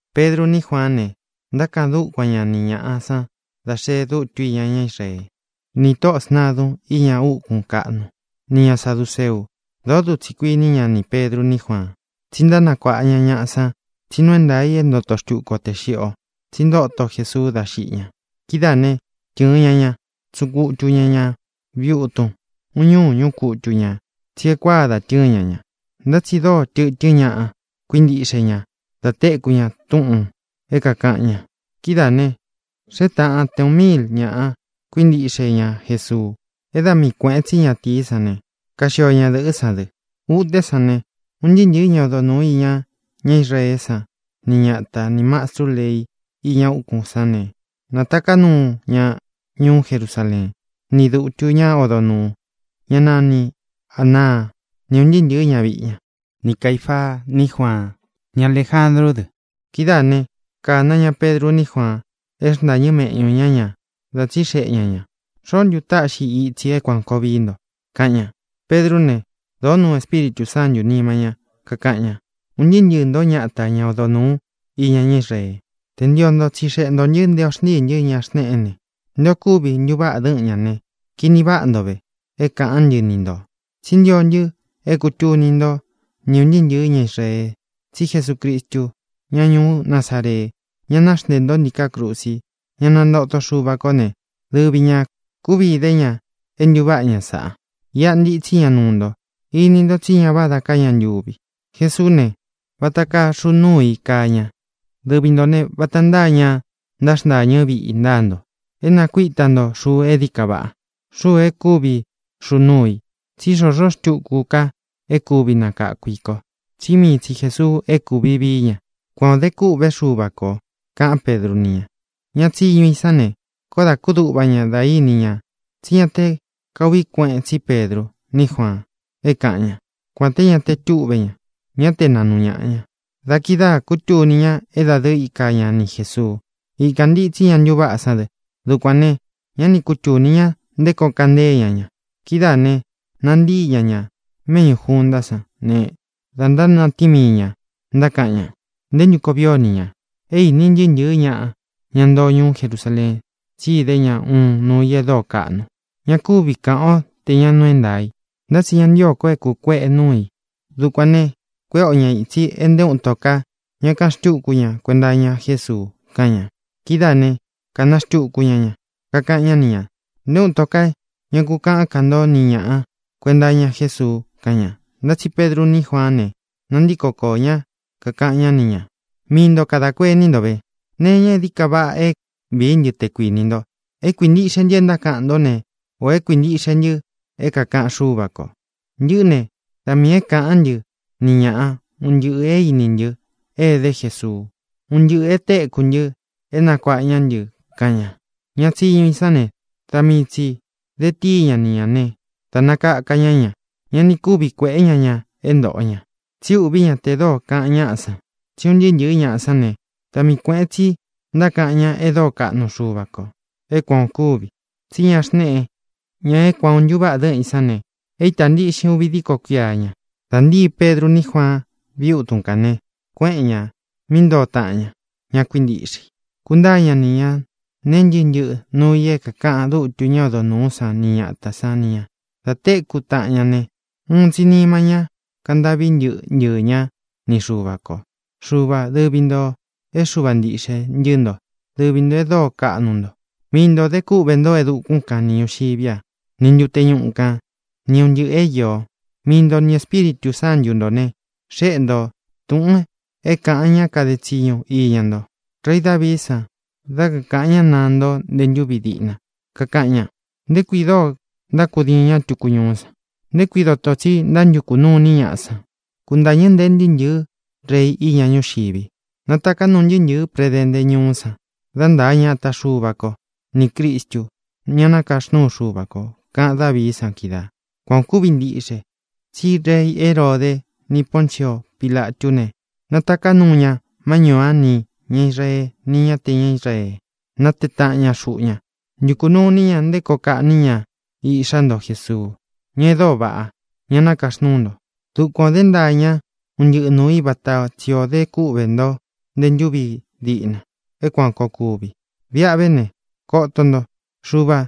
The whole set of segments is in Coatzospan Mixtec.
Pedru ní Juaán ne, ntákaꞌan dúkuan ña ni ñāꞌa san dá xee dutu íña ñá Israee, ni tóꞌō sntadun íña úkūn kaꞌnu, nī ña saduceu. Dōó dutsī kuiní ña nī Pedru ní Juaan, tsí ntánakuāꞌa ña ñaꞌa san tsí nuu é ntaā i é ntoto xtuku o tē xiꞌi o, tsí ntóto Jesuu dá xiꞌi ña. Kidáā né, tɨ̄ɨn ña ña, tsúꞌun kutu ña ñā viꞌi utun. Uun ñúū ñúꞌu kutu ñā, tsí e kuáa da tɨ́ɨn ña ñā. Ntá tsi dóo tɨtɨ́n ñaꞌa kuíntiꞌxe ña da téku ña túꞌūn é kākaꞌan ña. Kidáā ne, xée tāꞌan te uꞌun míil ñaꞌa kuíntiꞌxe ña Jesuu, é da mii kuēꞌen tsí ñatīí san ne, kaxio ñadɨ̄ꞌɨ́ san dɨ. Utén sān ne, un ntɨɨ́ ntɨ̄ɨ́ ña odo nūú iña ñá Israeé san, ni ñata, nī mastru lei iña úkūn sán ne, nātaká nuu ña ñuú Jerusaleen, ni dūtu, ñá odo nūu, ña nani Ānaá, ni ūn ntɨɨ́ ntɨ̄ɨ́ ñaviꞌi ña, ni Caīfaa, ní Juaan, ni Aléjandrú dɨ. Kidáā né, kāná ña Pedru ní Juaan é xntáñɨ meꞌñū ñá ña, da tsíxeꞌe ña ñā: —¿Xoó ntu táꞌxi i itsī é kuān koo vií nto? —kaꞌan ña. Pedrú ne, dōó nuu Espíritū Sántū nima ñá, kakaꞌan ña: —Un ntɨɨ́ ntɨɨ̄ ntó, ñata, ña odo nūú iña ñá Israee: te ntio nto tsixeꞌe ntō ntɨ́ nté ō xntíī ntɨ́ ña xneꞌé ne, nté ō kúvi ntuváꞌa dɨ́ꞌɨn ñā ne, kini váꞌa nto ve é kākaꞌán ntɨ ni ntō, tsí ntio ntɨ́ é kūtuni ntó ni ūn ntɨɨ́ ntɨ̄ɨ́ ña Israee tsí Jesucristu, ñá ñuú Nazaree, ña naxntéē ntó ntiká krusi, ña nantóto Xuva kō né, dɨvi ñā kúvi idé ña é ntūváꞌa ña sāꞌa. Iꞌa ntitsí ña nuu ntoo. Ini nto tsí ña vádā ká ña ntuvi. Jesuú ne, vata kaa xuu núu i kaa ña. Dɨvi ntō ne, vata ntáa ña ntáxntāñɨ́ viꞌi ntáa nto, é nākuíta nto xuu e dií ka vaꞌá, xuu e kúvi xuu núu i. Tsí xōxó xtuku ka é kuvi nakākú i kō, tsí mii tsi Jēsuu é kūvi vií ña. Kuan ō dé kûꞌvé Xuva kō —kaꞌán Pedru ni ña. Ña tsiñu i sán ne, koó dā kúduꞌva ña dá ini ña tsí ña te kauꞌvi kuéꞌen tsi Pedru ní Juaan é kaꞌan ña, kuān té ñá te tuꞌve ña, ñá te naꞌnu ñāꞌa ña. Da kidáā kútuni ña é dadɨɨ íka ña ni Jēsuu. Ikān ntitsí ña ntuváꞌa sán dɨ. Dukuān ne, ñá ni kútuni ñá nté koo kaꞌan ntée ña ña. Kidáā ne, nantíi ña ña méꞌñū juntá san ne, da ntánatíin mii ñā, ntákaꞌan ña: —¿Nté ntu koo vii o ni ñā? É īní ntɨɨ́ ntɨ̄ɨ́ ñaꞌa, ña ntoo ñuú Jerusaleen, tsí idé ña uun nuu i é dóo kaꞌnu. Ña kúvi kāꞌan o té ña nuu é ntaā i. Ntá tsi ña ntío ko é kūkueꞌe núu i. Dukuān ne, kuéꞌe o ña ītsi e nté uun ito ka ña kaꞌan xtúku ña kuenta iña Jésuu —kaꞌan ña. Kidáā né, kāna xtuku ña ña, kakaꞌan ñá ni ñā: —Nté uun ito ka ñá ku kāꞌán ka nto ni ñāꞌa kuenta iña Jésuu —kaꞌan ña. Ntá tsi Pedru ní Juaán ne, nantíko koō ñá, kakaꞌan ñá ni ñā: —Mii nto kadā kuení nto ve. ¿Nee iña é dií ka vaꞌa é vīí ntɨ, te kuinī nto: é kuintiꞌxe ntɨ é ntákaꞌan ntó ne, ō é kuintiꞌxe ntɨ é kākaꞌan Xúva kō? Ntɨꞌɨ́ ne, da miī é kāꞌán ntɨ ni ñaꞌa un ntɨꞌɨ̄ é īní ntɨ é edé Jesuu, un ntɨꞌɨ̄ e téku ntɨ é nakuāꞌa ñá ntɨ —kaꞌan ña. Ña tsiñu i sán ne, da mii tsī de tíi ña ni ñā né, dā nakaka ña ña. Ña ni kúvi kuēꞌé ña ña é ntōꞌo ña, tsi úꞌvī ñá tē dóo kaꞌan ñáꞌa san. Tsí un ntɨɨ́ ntɨ̄ɨ́ ñaꞌa sán ne, da mii kuēꞌen tsi ntákaꞌan ña e dóo kaꞌnu Xuva kō é kuan ō kúvi. Tsí ña xneꞌe, ña é kuan ō ntuváꞌa dɨ́ꞌɨn ī sán ne, e ítā ntiꞌxin uvi díko kuia ña. Dā ntíi Pedru ní Juaan víꞌi utun kān ne, kuéꞌen ñā mí ntoo taꞌan ña, ña kuíntiꞌxe i, kuntáa ña ni ñā nee ntɨ́ꞌɨ ntɨꞌɨ nuu i é kākaꞌan dutu ñá odo nūú san ni ñatā san ni ña. Dā téku taꞌan ña ne, uun tsi nima ñá kaꞌan ntâꞌvi ntɨɨ́ ntɨɨ̄ ñá ni Xuva kō: —Xuvā, dɨvi ntō é Xuva ntiꞌxe ntɨ́ nto; dɨvi ntō e dóo kaꞌnu nto. Mii ntō dé kúꞌvē ntó e dukún kan ni ñūxiví a, ni ntute ñuꞌu kān, ni un ntɨꞌɨ̄ é īo. Mii nto ni Ēspíritū Sántu ntō ne, xéꞌe nto túꞌūn é kāꞌan ña kade tsiñu iña nto, rei Davií san, dá kakāꞌan ñá naá nto nté ntūvi diꞌna, kakaꞌan ña: ¿Nté kui dóo ntákudiin ñá tuku ñuú san? ¿Nté kui doto tsī ó ntántukū nuu iní ñaꞌa san? Kuntañɨ̄ ntée ntɨɨ́ ntɨ̄ɨ́ rei iña ñúxivi, nātaká nuu ntɨɨ́ ntɨ̄ɨ́ predente ñúú san dá ntāa ña ata Xuva ko ní Cristu, ña nakaxnúu Xuva kō, kaꞌan Dávií san kídaā. ʼKuan ō kúvi ntiꞌxe tsí rei Heróde ni Pōncio Pilatú ne, nātaká nuu ña má ñūú a nī ña Israee ni ña é ña te ña Israee, nátee taꞌan ña xuꞌu ñá, ntukū nuu iní ña nté koo kaꞌní ña Iꞌxá nto Jesuu, ña e dóo vaꞌá, ña nakaxnúu nto. Dukuan ō dé ntaa ña un ntɨꞌɨ nuu i vata tsi ō dé kúꞌvē ntó nte ntúvi diꞌna é kuān koo kuvi. Viꞌa ve ne, koto nto, Xuvā,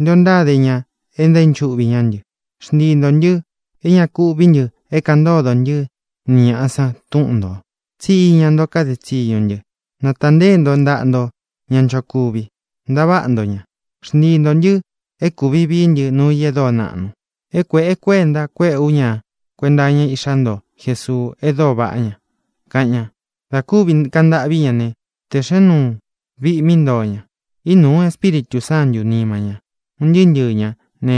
nté o ntáde ña e ntaínchuꞌvi ñá ntɨ. Xntii ntō ntɨ́ é ña ku uꞌví ntɨ é kāꞌan ntódo ntɨ́ ni ñāꞌa san túꞌun nto, tsí iña nto kade tsiñu ntɨ. Nátānteé nto ntaꞌa nto ña nchokuvi, ntaváꞌa nto ñā. Xntii ntō ntɨ́ é kūvi vií ntɨ nuu i e dóo naꞌnu, e kueꞌe kuenta kueꞌe u ña kuenta iña Íꞌxá nto Jesuu e dóo vaꞌá ña —kaꞌan ña. Dā kúvi kaꞌan ntâꞌví ña ne, tēꞌxén nuu viꞌi mí ntoo ña. Ínūu Espíritū Sántū nima ñá, un ntɨɨ́ ntɨɨ̄ ñá ne,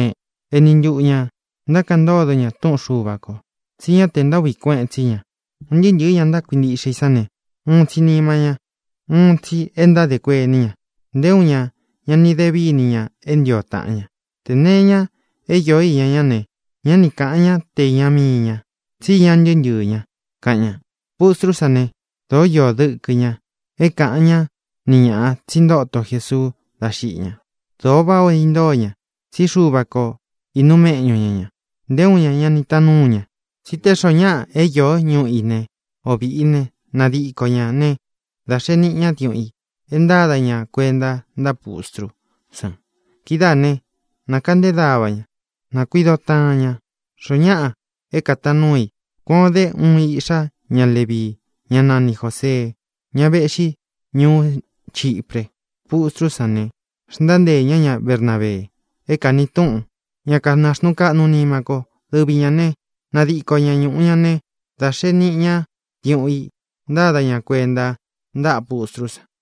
eni ntuꞌu ñā ntákaꞌan ntódo ña túꞌun Xuva kō, tsí ña te ntaúꞌvi kueꞌen tsí ña. Un ntɨɨ́ ntɨ̄ɨ́ ña kuíntiꞌxe i sán ne, uun tsi nima ña, uun tsi é ntádē kuení ña. Nté uun ña ña ni de víni ña é ntio taꞌan ña. Tē nee iña é io īña ñá ne, ñá ni kāꞌan ñá te īña mii ña, tsí iña ntɨɨ́ ntɨɨ̄ ñá, kaꞌan ña. Pustrú san ne, dōó iō dɨkɨ ña é kāꞌan ñá ni ñāꞌa tsí ntóto Jēsuu dá xiꞌi ña. Dōo váꞌa ō intóo ña, tsí Xuva ko īnuu méꞌñu ña ñā. Nté uun ña ña ni taan núu ña, tsí tē xoó ñaꞌa é īó ñuꞌu í ne, ō viꞌi i ne, nadiko ñā ne, dá xēe niꞌi ñá diuꞌun i é ntāda ña kuenta ntáꞌa pustrú san. Kidáā ne, nakeꞌnté dava ña, na kuīdo taꞌan ña, xoo ñáꞌa é kātaan núu i. Kuān o dé uun iꞌxá ña Levii, ñá nani Jōsee, ñá vēꞌxí ñuú Chipre. Pustrú san ne, xntánteē ñá ña Bernabee, é kāni túꞌun Ña Kanaxnuu Kaꞌnu Nima Ko. Dɨvi ñā né, nadiko ña ñūꞌu ña ne, da xee niꞌi ñá diuꞌun i, ntāda ña kuenta ntáꞌa pustrú san.